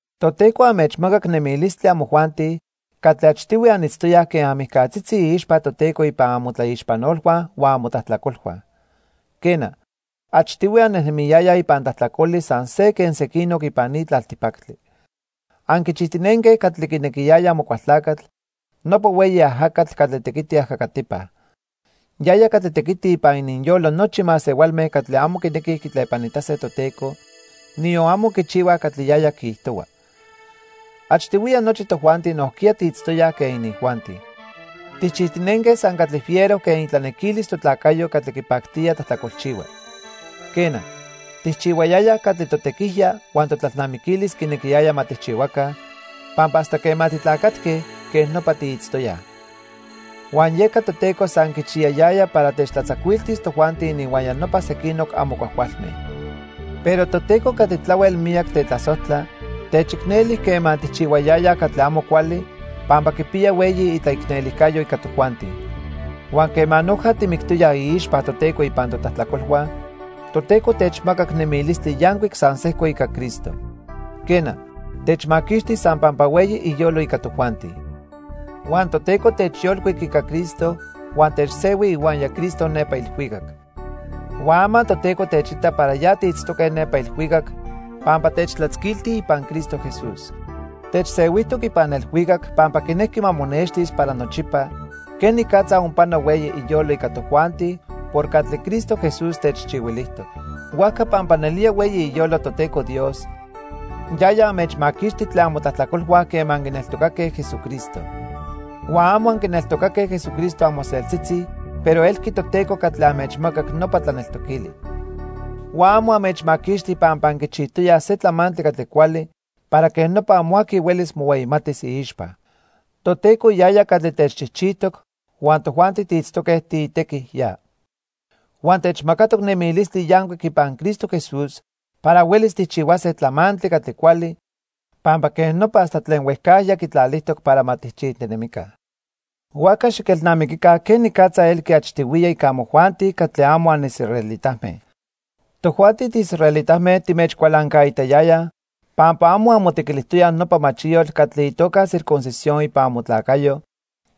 Toteco anmechmacac nemilistli amojuanti catli achtihui anitztoyaj quen anmijcatzitzi iixpa Toteco ipan amotlaixpanolhua huan amotlajtlacolhua. Quena, achtihui annejnemiyayaj ipan tlajtlacoli san se quen sequinoc ipan ni tlaltipactli. Anquichijtinenque catli quinequiyaya Amocualtlacatl, nopa hueyi ajacatl catli tequiti ajacatipa. Yaya catli tequiti ipan ininyolo nochi masehualme catli amo quinequij quitlepanitase Toteco, niyon amo quichihuaj catli yaya quiijtohua. Achtihuiya nochi tojuanti nojquiya tiitztoyaj quen inijuanti. Tijchijtinenque san catli fiero quen itlanequilis totlacayo catli quipactía tlajtlacolchihua. Quena, tijchihuayayaj catli totequijya huan totlalnamiquilis quinequiyaya ma tijchihuaca, pampa hasta quema titlacatque, quej nopa tiitztoyaj. Huan yeca Toteco san quichiyayaya para techtlatzacuiltis tojuanti ininhuaya nopa sequinoc amo cuajcualme. Pero Toteco catli tlahuel miyac tetlasojtla, techicneli quema tijchihuayayaj catli amo cuali pampa quipiya hueyi itlaicnelijcayo ica tojuanti. Huan quema noja timictoyaj iixpa Toteco ipan totlajtlacolhua, Toteco techmacac nemilistli yancuic san sejco ica Cristo. Quena, techmaquixti san pampa hueyi iyolo ica tojuanti. Huan Toteco techyolcuic ica Cristo huan techsehui ihuaya Cristo nepa ilhuicac. Huan ama Toteco techita para ya tiitztoque nepa ilhuicac pampa techtlatzacuilti ipan Cristo Jesús. Techsehuijtoc ipan ilhuicac pampa quinejqui ma monextis para nochipa quenicatza onpano hueyi iyolo ica tojuanti por catli Cristo Jesús techchihuilijtoc. Huajca pampa nelía hueyi iyolo Toteco Dios, yaya anmechmaquixti tlen amotlajtlacolhua quema anquineltocaque Jesucristo. Huan amo anquineltocaque Jesucristo amoseltzitzi pero elqui Toteco catli anmechmacac nopa tlaneltoquili. Huan amo anmechmaquixti pampa anquichijtoyaj se tlamantli catli cuali para quej nopa amo aqui huelis mohueyimatis iixpa. Toteco yaya catli techchijchijtoc huan tojuanti tiitztoque tiitequij ya. Huan techmacatoc nemilistli yancuic ipan Cristo Jesús para huelis tijchihuase tlamantli catli cuali pampa quej nopa hasta tlen huejcajya quitlalijtoc para ma tijchijtinemica. Huajca xiquelnamiquica quenicatza elqui achtihuiya ica amojuanti catli amo anisraelitame. Tojuanti tiisraelitame timechcualancaitayayaj pampa amo anmotequilijtoyaj nopa machiyotl catli itoca circuncisión ipan amotlacayo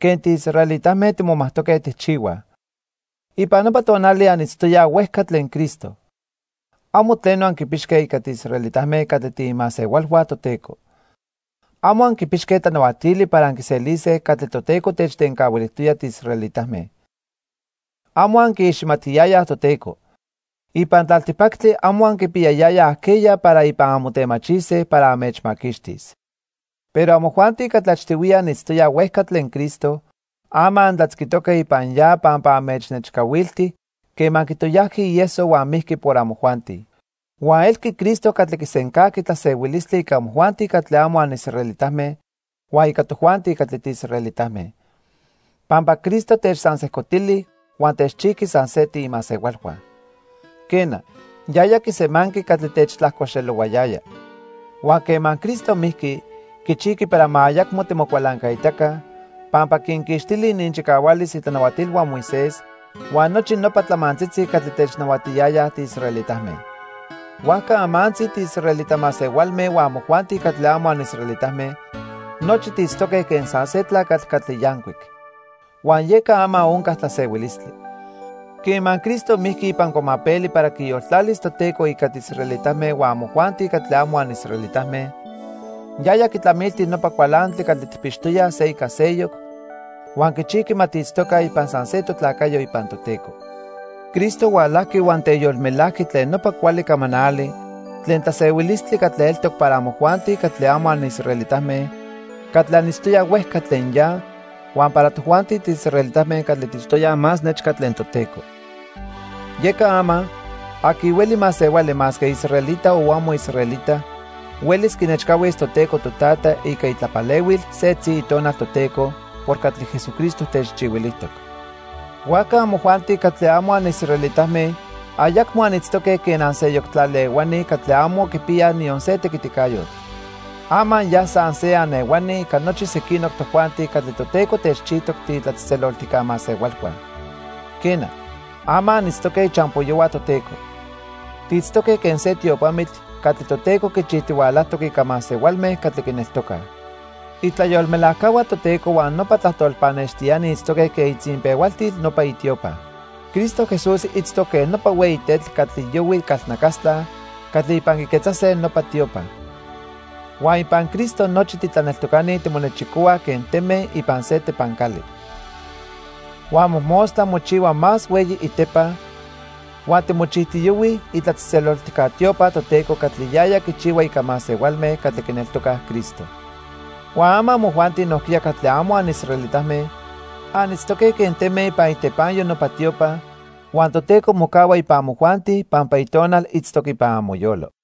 quen tiisraelitame timomajtoque tijchihuaj. Ipan nopa tonali anitztoyaj huejca tlen Cristo. Amo tleno anquipixque ica tiisraelitame catli tiimasehualhua Toteco. Amo anquipixque tlanahuatili para anquiselise catli Toteco techtencahuilijtoya tiisraelitame. Amo anquiiximatiyayaj Toteco. Ipan tlaltipactli amo anquipiyayayaj ajqueya para ipan anmotemachise para anmechmaquixtis. Pero amojuanti catli achtihuiya anitztoyaj huejca tlen Cristo, ama antlatzquitoque ipan ya pampa anmechnechcahuilti quema quitoyajqui ieso huan mijqui por amojuanti. Huan elqui Cristo catli quisencajqui tlasehuilistli ica amojuanti catli amo anisraelitame huan ica tojuanti catli tiisraelitame, pampa Cristo techsansejcotili huan techchijqui san se tiimasehualhua. Quena, yaya quisemanqui catli techtlajcoxelohuayaya. Huan quema Cristo mijqui, quichijqui para ma ayacmo timocualancaitaca, pampa quinquixtili ininchicahualis itlanahuatilhua Moisés huan nochi nopa tlamantzitzi catli technahuatiyaya tiisraelitame. Huajca amantzi tiisraelita masehualme huan amojuanti catli amo anisraelitame, nochi tiitztoque quen san se tlacatl catli yancuic. Huan yeca ama onca tlasehuilistli. Quema Cristo mijqui ipan cuamapeli para quiyoltlalis Toteco ica tiisraelitame huan amojuanti catli amo anisraelitame, yaya quitlamilti nopa cualantli catli tijpixtoyaj se ica seyoc huan quichijqui ma tiitztoca ipan san se totlacayo ipan Toteco. Cristo hualajqui huan teyolmelajqui tlen nopa cuali camanali tlen tlasehuilistli catli eltoc para amojuanti catli amo anisraelitame catli anitztoyaj huejca tlen ya huan para tojuanti tiisraelitame catli tiitztoyaj más nechca tlen Toteco. Yeca ama, aqui hueli masehuali masque israelita o amo israelita huelis quinechcahuis Toteco Totata ica itlapalehuil setzi Itonal Toteco por catli Jesucristo techchihuilijtoc. Huajca amojuanti catli amo anisraelitame ayacmo anitztoque quen anseyoc tlali ehuani catli amo quipiyaj niyon se tequiticayotl. Ama ya san se anehuani ica nochi sequinoc tojuanti catli Toteco techchijtoc tiitlatzejtzeloltijca masehualhua. Quena, ama anitztoque ichampoyohua Toteco. Tiitztoque quen se tiopamitl catli Toteco quichijtihualajtoc ica masehualme catli quineltocaj. Itlayolmelajcahua Toteco huan nopa tlajtol pannextiani itztoque quen itzinpehualtil nopa itiopa. Cristo Jesús itztoc quen nopa hueyi tetl catli yohui calnacastla catli ipan quiquetzase nopa tiopa. Huan ipan Cristo nochi titlaneltocani timonechicohuaj quen teme ipan se tepancali. Huan mojmostla mochihua más hueyi itepa huan timochijtiyohuij itlatzejtzeloltijca tiopa Toteco catli yaya quichihua ica masehualme catli quineltocaj Cristo. Huan ama amojuanti nojquiya catli amo anisraelitame anitztoque quen teme ipan itepanyo nopa tiopa, huan Toteco mocahua ipan amojuanti pampa Itonal itztoc ipan amoyolo.